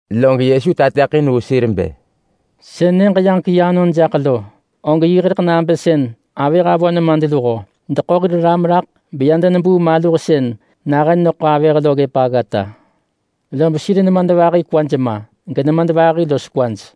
Log Yesu tateḳin vu sir bë, “Sën Nyëġ-yaġek-yi anon jaḳ lo, og yiḳ rëḳ nabë sën avëh avö nemadluho deḳo hir ram raḳ beya denebuu maluh sën nahën neḳo avëh lo ggëp aggata. Lob sir nemadvahi kwaj ma, genemadvahi los kwaj.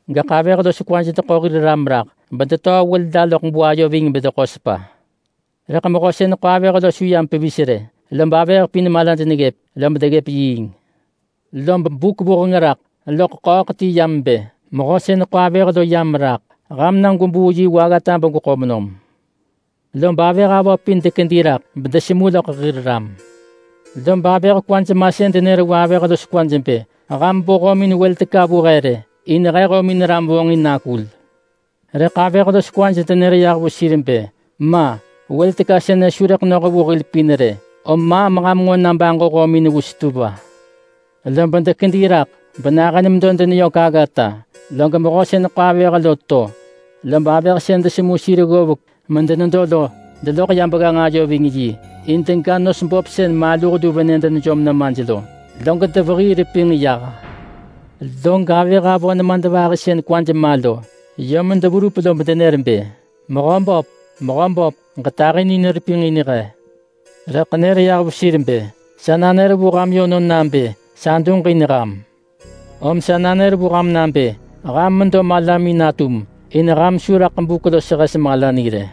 Gaḳ avëh los kwaj deḳo hir ram raḳ bedetöö wël la loḳ buayo ving bedeḳo sepa. Rëḳ mehö sën ḳo avëh lo su yam pevis rë, lob avëh pin malaj neggëp, lob deggëp yiing. Lob buk vuheng raḳ loḳ ḳööḳ ti yam bë, ‘Mehö sën ḳo avëh lo yam raḳ. Ham na gwebuu yi vu aggata begweḳo menam!’ Lob avëh avö pin dekedi raḳ bedesemu loḳ hir ram. Lob avëh kwaj masën denër vu avëh los kwaj bë, ‘Ham bo hömin wël teka vu he rë, in he hömin ram vonġin nakul!’ Rëḳ avëh los kwaj denër yah vu sir bë, ‘Ma! Wël teka sënë su rëḳ noh vu hil pin rë. Om maam ham nġo na baġo hömin vu setuwa!’ Lob dekedi raḳ benahën medo deneyök aggata, log mehö sën ḳo avëh lo to. Lob avëh sën desemu sir ggovek medenedo lo deloḳ ya begganġ ayo ving yi in dega nos böp sën maluh lu venë denejom nemaj lo. Log devehii repinġ yah. Log avëh avö nemadvahi sën kwaj ma lo yom deverup lob denër bë, ‘Mehö böp, mehö böp! Ġetahinin repinġ in he!’ Rëḳ nër yah vu sir bë, ‘Sa nanër vu ham yönon nabë sa duġin ham!’ Om sa nanër vu ham nabë ham medo malamin natum, in ham su raḳ buk los hes mala ni rë.”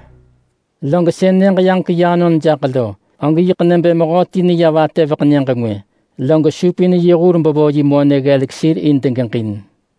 “Log sën Nyëġ-yaġek-yi anon jaḳ lo, og yiḳ nebë mehö ti neya vatëveḳ nyëġ ngwë, log supin yi hur bevo yi monë ggelek sir in degeġin.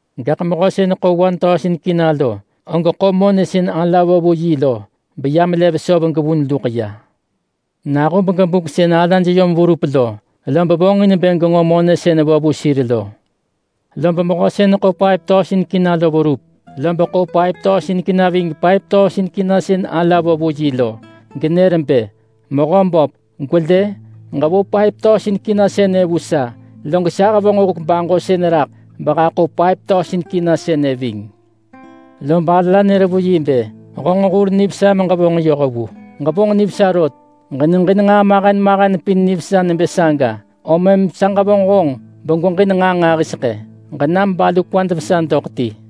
Gaḳ mehö sën ḳo K1000 lo, og ḳo monë sën ala vo vu yi lo beya melev söv gevun luḳ ya. Nahub gebuk sën alaj yom verup lo, lob vonġin bë genġo monë sën vo vu sir lo. Lob mehö sën ḳo K5000 lo verup, lob ḳo K5000 ving K5000 sën ala vo vu yi lo, genër bë, ‘Mehö böp! Gwelë! Ġevo K5000 sënë vu sa, log sa hevonġ huk baġosën raḳ behaḳo K5000 sënë ving.’ Lob ala nër vu yi bë, ‘Honġ hur nivesa meġevonġ yoh vu. Ġevonġ nivesa rot! Ġeneġin nġaa mahen mahen pin nivesa nebë saga, om mëm sa ġevonġ honġ begweġin nġaa nġahiseḳë. Ġenam balu kwad vesa doḳ ti.’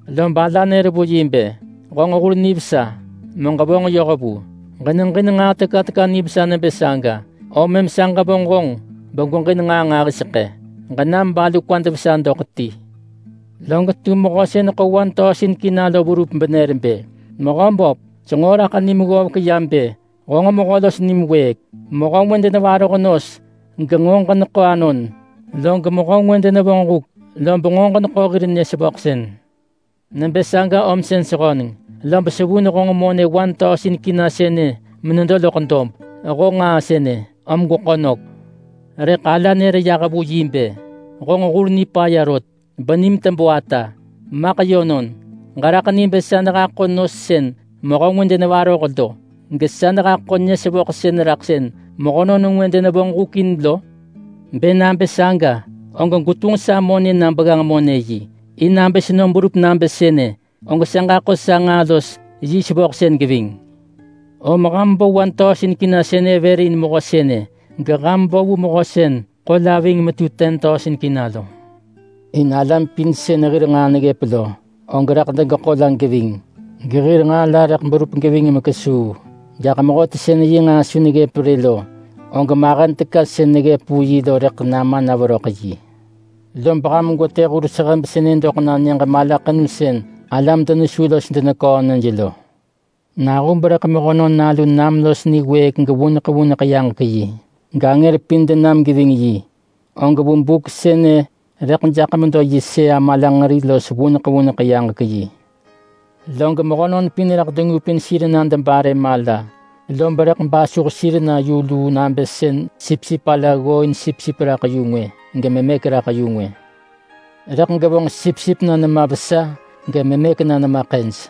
Lob ala nër vu yi bë, ‘Honġ hur nivesa, meġevonġ yoh vu! Ġeneġin nġaa teka teka nivesa nebë saga, om mëm sa ġevonġ honġ begweġin nġaa nġahiseḳë. Ġenam balu kwad vesa doḳ ti.’ Log tum mehö sën ḳo K1000 lo verup benër bë, ‘Mehö böp! Senġo raḳ nim ggovek ya bë honġ mehö los nim wëëk. Mehö ngwë denevaroh nos genġo ġeneḳo anon. Log mehö ngwë denevonġ huk, lob nġo ġeneḳo hir nyë-sevöḳsën. Nebë saga om sën sehöneng, lob sevun honġ monë K1000 sënë menedo loḳ dob. Honġ nġaa sënë, om gweḳo nök!’ Rëḳ ala nër yah vu yi bë, ‘Honġ hur nipaya rot! Benim tebö ata! Maḳ yönon, ġeraḳ ni bë sa nehaḳo nos sën mehö ngwë denevaroh lo, gesa nehaḳo nyë-sevöḳsën raḳ sën mehönon ngwë denevonġ huk in lo? Bë nabë saga, og gwetunġ sa monë na begganġ-monë-yi, in nabë senom berup nabë sënë, og sa ġaḳo sa nġaa los yi sevöḳsën geving. Om ham bo K1000 sënë vër in mehö sënë geham bo vu mehö sën ḳo la ving metu K10,000 lo. In alam pin sën hir nġaa neggëp lo, og rëḳ degeḳo la geving, gehir nġaa la rëḳ berup geving mekesuu. Gaḳ mehöti sën yi nġaa su neggëp rë lo, og mahen teka sën neggëp vu yi lo rëḳ nama na veröḳ yi. Lob ham gwetë hur sehëb sënë doḳ na nyëġ malaḳenu sën alam denesu los deneköö nyëj lo.’” “Nahub rëḳ Mehönon Nalu nam los niwëëk gevuneḳ vuneḳ yaġek-yi, gangër pin denam geving yi, og vu buk sënë rëḳ jaḳ medo yi sëa malanġeri los vuneḳ vuneḳ yaġek-yi. Log mehönon pin rëḳ dengupin sir na debare mala. Lob rëḳ basuh sir na yu luu nabë sën sipsip ala ggooin sipsip raḳ yu ngwë, gememëk raḳ yu ngwë. Rëḳ gevonġ sipsip na nema vesa, gememëk na nema ḳëj.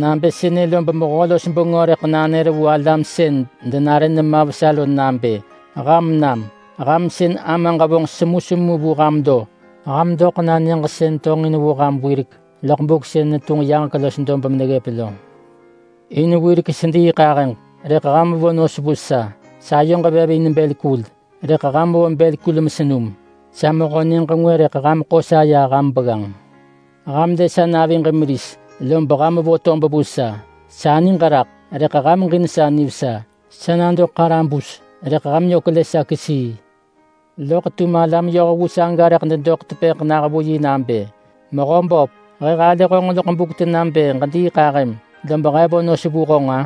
Nabë sënë lob Mehö-los-bengö rëḳ nanër vu alam sën denare nema vesa lo nabë, ‘Ham nam! Ham sën Amaġ vonġ semusemu vu ham lo. Ham doḳ na nyëġ sën tonġin vu ham wirek loḳ buk sën netunġ yaġek los dob meneggëp lo. In wirek sediiḳahëġ, rëḳ ham vo nos vu sa. Sayoġ vev in bël kul, rëḳ ham vo bël kul mesenum. Sa mehö nyëġ ngwë rëḳ ham ḳo sa ya ham begganġ. Ham lë sa naviġ meris, lob ham vo tob vu sa. Sa niġ raḳ, rëḳ ham ġin sa nivesa. Sa nado ḳarabus, rëḳ ham yök lë sa kesii.’ Loḳ tum alam yohvu saga rëḳ dedoḳ tepëḳ nah vu yi nabë, ‘Mehöböp! He halë loḳ buk tena bë ġediiḳahëm lob he vo nos vu honġ-a?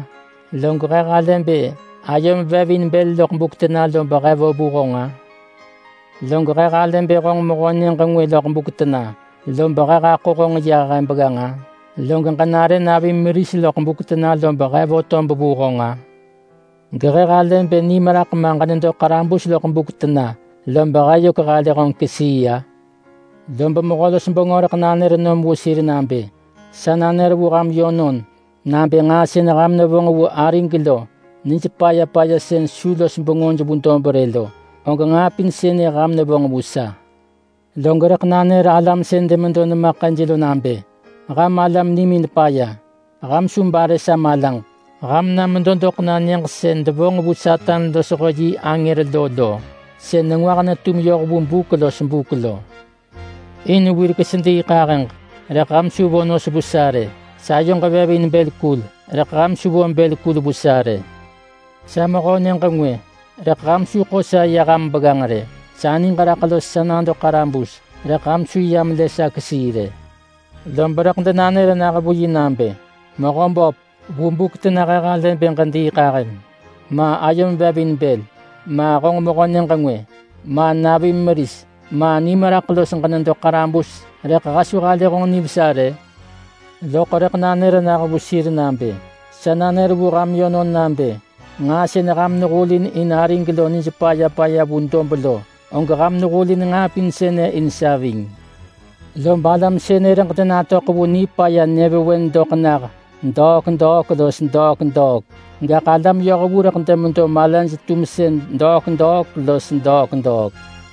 Log he halë bë ayom vev in bël loḳ buk tena lob he vo vu honġ-a? Log he halë bë honġ mehö nyëġ ngwë loḳ buk tena, lob he haḳo honġ ya he begganġ-a? Log ġenare navim meris loḳ buk tena lob he vo tob vu honġ-a? Gehe halë bë nim raḳ ma ġenedo ḳarabus loḳ buk tena, lob he yök halë honġ kesii-a?’ Lob Mehö-los-bengö rëḳ nanër vu sir nabë, ‘Sa nanër vu ham yönon nabë nġaa sën ham nevonġ vu arig lo nij paya paya sën su los bengöj vu dob rë lo, og nġaa pin sënë ham nevonġ vu sa.’ Log rëḳ nanër alam sën demedo nema ḳëj lo nabë, ‘Ham alam nimin paya! Ham su bare sa malaġ. Ham na medoḳ na nyëġ sën devonġ vu Satan losho yi angër lo. Sën nengwah netum yoh vu buk los buk lo. In wirek sediiḳahëġ, rëḳ ham su vo nos vu sa rë. Sayoġ vev in bël kul, rëḳ ham su vo bël kul vu sa rë. Sa mehö nyëġ ngwë, rëḳ ham su ḳo sa ya ham begganġ rë. Sa niġ raḳ los sa nado ḳarabus, rëḳ ham su yam lë sa kesii rë.’ Lob rëḳ denanër nah vu yi nabë, ‘Mehöböp! Vu buk tena he halë bë ġediiḳahëm, ma ayom vev in bël, ma honġ mehö nyëġ ngwë, ma navim meris, ma nim raḳ los ġenedo ḳarabus rëḳ he su halë honġ nivesa rë?’ Loḳ rëḳ nanër nah vu sir nabë, ‘Sa nanër vu ham yönon nabë nġaa sën ham nehulin in arig lo nij paya paya vu dob lo, og ham nehulin nġaa pin sënë in sa ving.’ Lob alam sënë rëḳ denatöḳ vu nipaya nyëvewen doḳ nah degwata los degwata. Gaḳ alam yohvu rëḳ demedo malaj-tumsën degwata los degwata.”